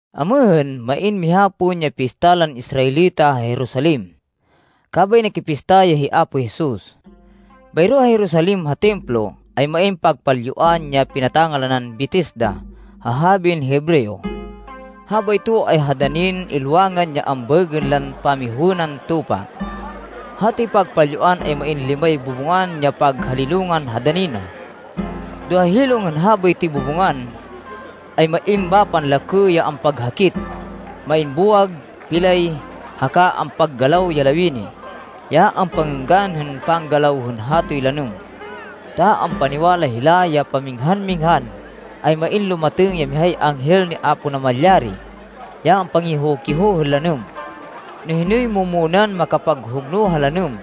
Amêhên, main miha pon ya pista lan Israelita ha Jerusalem. Kabay nakipista ya hi Apo Jesus. Bayro ha Jerusalem ha Templo, ay main pagpalyuan, ya pinata-ngalanan Betesda ha habin Hebreo. Habayto ay ha danin ilwangan ya ambaêgên lan Pamihowênan tupa. Hatoy pagpalyuan ay main limay bubungan ya paghalilungan ha dani na. Do ha hilong hên habaytoy bubungan, ay main bapan lakê ya ampaghakit. Main buwag, pilay, haka a ampakagalaw ya lawini, ya ampangênggan hên panggalaw hên hatoy lanêm, ta ampaniwala hila ya paminghan-minghan, ay main lumatêng ya mihay anghel ni Apo Namalyari, ya ampangiho-kiho hên lanêm. No hinoy mu-munan makapaghugno ha lanêm,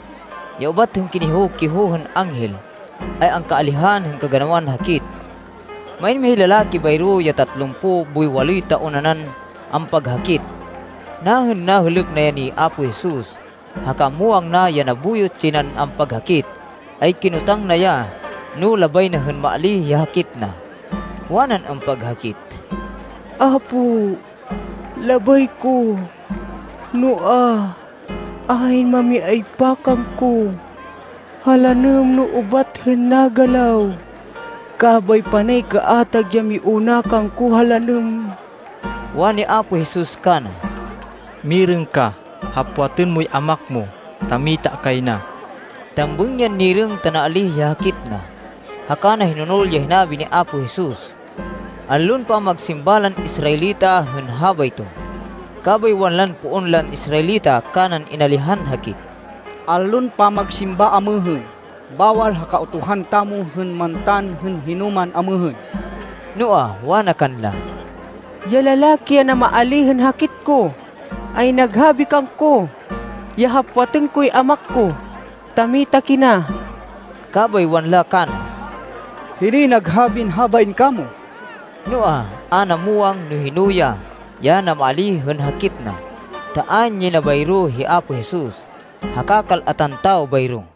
ya ubat hên kiniho-kiho hên anghel, ay angkaalihan hên kaganawan hakit. Main mihay lalaki bayro, ya tatlumpo boy waloy taon nanan ampaghakit. Nahên nahêlêk na ya ni Apo Jesus, haka muwang na ya nabuyot yay nan ampaghakit, ay kinotang na ya no labay na hên maalíh ya hakit na. Wanan ampaghakit, “Apo, labay ko, noa, ayn mami-aypa kangko ha lanêm no ubat hên nagalaw. Kabay panay kaatag ya miuna kangko ha lanêm.” Wani Apo Jesus kana, “Mirêng ka. Hapwatên moy amak mo, ta mita kay na.” Tambêng yan nirêng ta naalíh ya hakit na. Haka na hinonol ya hinabi ni Apo Jesus. Allon pamagsimba lan Israelita hên habayto. Kabay wanlan poon lan Israelita kanan inalihan hakit, “Allon pamagsimba amêhên. Bawal ha Kautuhan tamo hên mantan hên hinoman amêhên.” Noa, wana kanla, “Ya lalaki ya namaalíh hên hakit ko, ay naghabi kangko, ya hapwatên koy amak ko, ta mita kina.” Kabay wanla kana, “Hinoy naghabin habain kamo?” Noa, a na muwang, no hino ya, ya namaalíh hên hakit na, ta ayn yay na bayro hi Apo Jesus, haka kal-atan tawo bayro.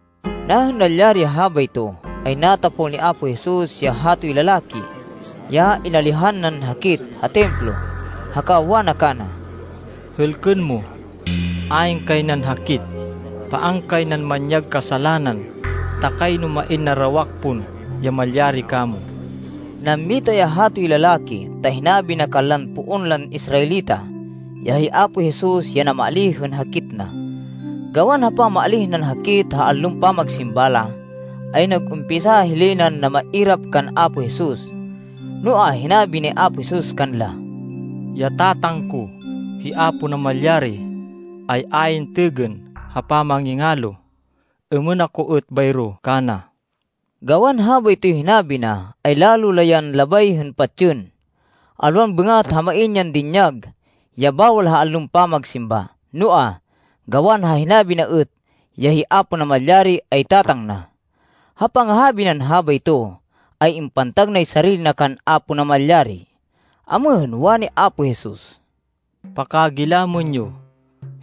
Nahên nalyari ya habayto, ay natapol ni Apo Jesus ya hatoy lalaki, ya inalihan nan hakit ha Templo, haka wana kana, “Hêlkên mo, ayn kay nan hakit. Paan kay nan manyag kasalanan, ta kayno main narawak pon ya malyari kamo.” Nammita ya hatoy lalaki, ta hinabi na kanlan poon lan Israelita, ya hi Apo Jesus, ya namaalíh hên hakit na. Gawan ha pamaalíh nan hakit ha allon pamagsimba la, ay nag-umpisa hilay nan namairap kan Apo Jesus. Noa, hinabi ni Apo Jesus kanla, “Ya Tatang ko, hi Apo Namalyari, ay ayn têgên ha pamangingalo. Êmên ako êt bayro kana.” Gawan habaytoy hinabi na, ay lalo la yan labay hên patsên, alwan bêngat ha main yan dinyag, ya bawal ha allon pamagsimba, noa, gawan ha hinabi na êt, ya hi Apo Namalyari ay Tatang na. Ha pangahabi nan habayto, ay impantag nay sarili na kan Apo Namalyari. Amêhên, wani Apo Jesus, “Pakagilamên yo,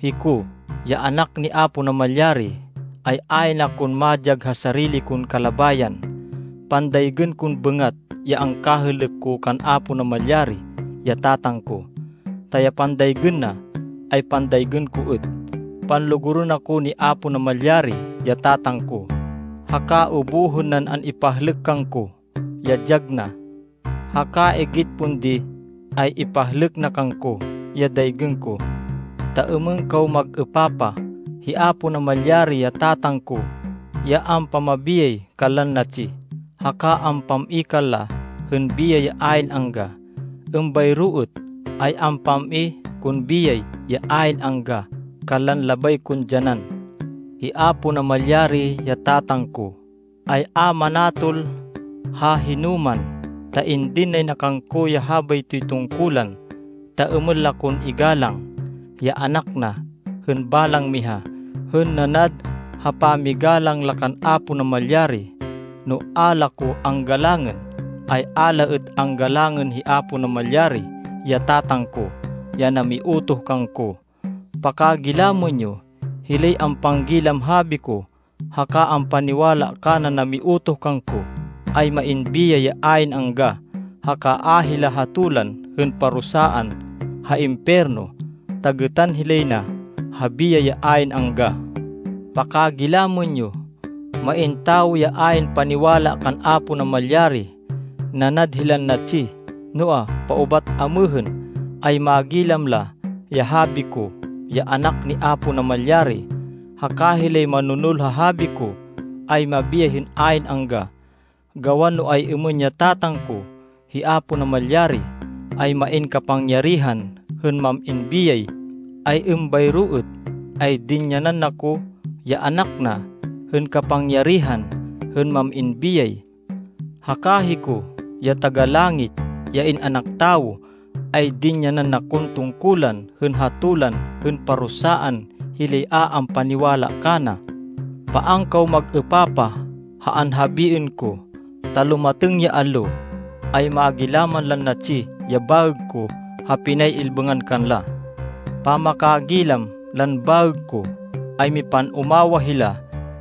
hiko, ya Anak ni Apo Namalyari, ay ayn akon madyag ha sarili kon kalabayan. Pandaygên kon bêngat ya angkahêlêk ko kan Apo Namalyari, ya Tatang ko, ta ya pandaygên na, ay pandaygên ko êt. Panlugurên ako ni Apo Namalyari, ya Tatang ko, haka ubuhên nan an-ipahlêk kangko ya dyag na. Haka igit pon di ay ipahlêk na kangko ya daygên ko, ta êmên kaw mag-êpapah. Hi Apo Namalyari, ya Tatang ko ya ampamabiyay kanlan natsi, haka ampam-i kanla hên biyay ya ayn angga. Êmbayro êt, ay ampam-i kon biyay ya ayn angga kanlan labay kon dyanan. Hi Apo Namalyari, ya Tatang ko, ay a manatol ha hinoman, ta indin nay na kangko ya habaytoy tungkulan, ta êmên la kon igalang, ya Anak na, hên balang miha, hên nanad ha pamigalang la kan Apo Namalyari. No a la ko anggalangên, ay a la êt anggalangên hi Apo Namalyari, ya Tatang ko, ya namiutoh kangko. “Pakagilamên yo! Hilay ampanggilam habi ko, haka ampaniwala kanan namiutoh kangko, ay main biyay ya ayn angga. Haka a hila hatolan hên parusaan ha impiyerno, ta gêtan hilay na ha biyay ya ayn angga. Pakagilamên yo! Main tawo ya ayn paniwala kan Apo Namalyari. Nanad hilan natsi. Noa, paubat amêhên, ay magilam la ya habi ko, ya Anak ni Apo Namalyari. Haka hilay manonol ha habi ko, ay mabiyay hên ayn angga. Gawan no ay-êmên ya Tatang ko, hi Apo Namalyari, ay main kapangyarihan hên mam-in biyay, ay êmbayro êt ay dinyanan na ko, ya Anak na, hên kapangyarihan hên mam-in biyay. Haka hiko, ya Taga-Langit, ya In-anak Tawo, ay dinyanan na kon tungkulan hên hatolan hên parusaan hilay a ampaniwala kana. Paan kaw mag-êpapah ha anhabiên ko, ta lumatêng ya allo, ay magilaman lan natsi ya baêg ko ha pinay-ilbêngan kanla. Pamakagilam lan baêg ko, ay mipan-umawah hila.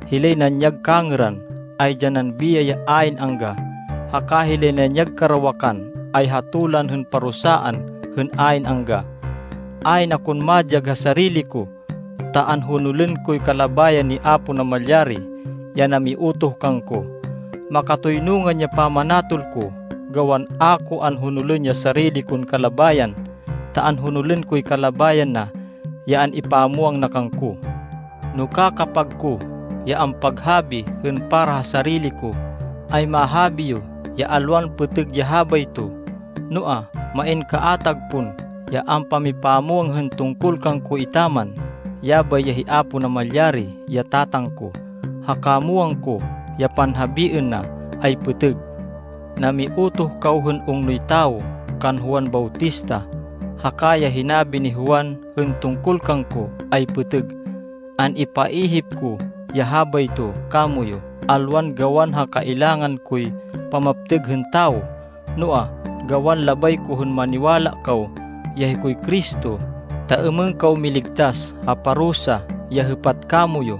Hilay nanyag kangêran, ay dyanan biyay ya ayn angga. Haka hilay nanyag karawakan, ay hatolan hên parusaan hên ayn angga. “Ayn akon madyag ha sarili ko, ta anhonolên koy kalabayan ni Apo Namalyari, ya namiutoh kangko. Makatoynungan ya pamanatol ko, gawan a ko anhonolên ya sarili kon kalabayan, ta anhonolên koy kalabayan na ya an-ipamwang na kangko. “No kakapag ko ya ampaghabi hên para ha sarili ko, ay mahabi yo ya alwan pêtêg ya habayto. Noa, main kaatag pon ya ampamipamwang hên tungkol kangko etaman. Yabay ya hi Apo Namalyari, ya Tatang ko, haka muwang ko ya panhabiên na ay pêtêg. Namiutoh kaw hên ungnoy tawo kan Juan Bautista, haka ya hinabi ni Juan hên tungkol kangko ay pêtêg. An-ipaihip ko ya habayto kamoyu, alwan gawan ha kailangan koy pamaptêg hên tawo, noa, gawan labay ko hên maniwala kaw, ya hikoy Cristo, ta êmên kaw miligtas ha parusa, ya hêpat kamoyu.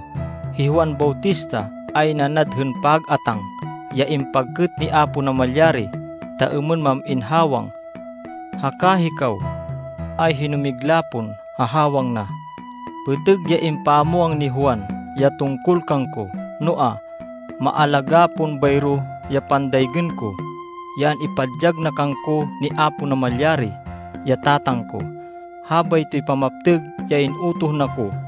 Hi Juan Bautista, ay nanad hên pag-atáng ya impagkêt ni Apo Namalyari, ta êmên mam-in hawang. Haka hikaw ay hinumigla pon ha hawang na. Pêtêg ya impamwang ni Juan, ya tungkol kangko, noa, maalagá pon bayro ya pandaygên ko, ya an-ipadyag na kangko ni Apo Namalyari, ya Tatang ko. Habaytoy pamaptêg ya in-utoh na ko.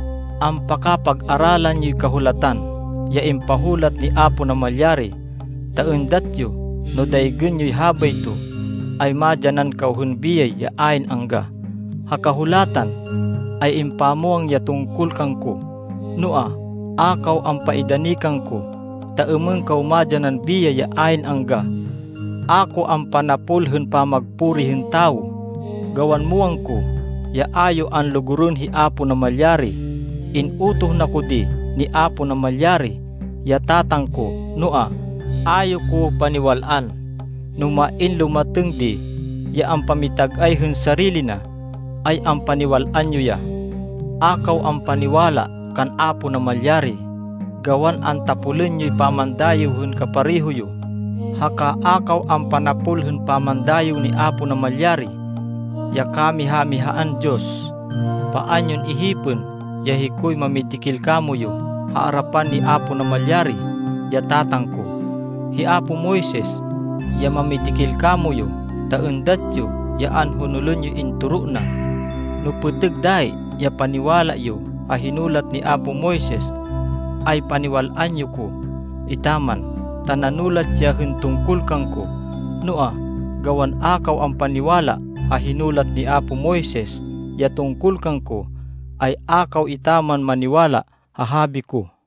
Ampakapag-aralan yoy Kahulatan ya impahulat ni Apo Namalyari, ta êndat yo no daygên yoy habayto, ay madyanan kaw hên biyay ya ayn angga. Ha Kahulatan ay impamwang ya tungkol kangko. Noa, a kaw ampaidani kangko, ta êmên kaw madyanan biyay ya ayn angga. “A ko ampanapol hên pamagpuri hên tawo, gawan muwang ko ya a yo anlugurên hi Apo Namalyari. In-utoh na ko di ni Apo Namalyari, ya Tatang ko, noa, a yo ko paniwal-an. No main lumatêng di ya ampamitag-ay hên sarili na, ay ampaniwal-an yo ya. A kaw ampaniwala kan Apo Namalyari gawan antapolên yoy pamandayêw hên kapareho yo, haka a kaw ampanapol hên pamandayêw ni Apo Namalyari, ya kamiha-mihaan Diyos. Paan yon ihipên ya hikoy mamidikil kamoyu ha arapan ni Apo Namalyari, ya Tatang ko. Hi apo Moises, ya mamidikil kamoyu ta êndat yo ya anhonolên yoy intoro na. No pêtêg dayi ya paniwala yo ha hinulat ni apo Moises, ay paniwal-an yo ko etaman, ta nanulat ya hên tungkol kangko. Noa, gawan a kaw ampaniwala ha hinulat ni apo Moises ya tungkol kangko, ay a kaw etaman maniwala ha habi ko!”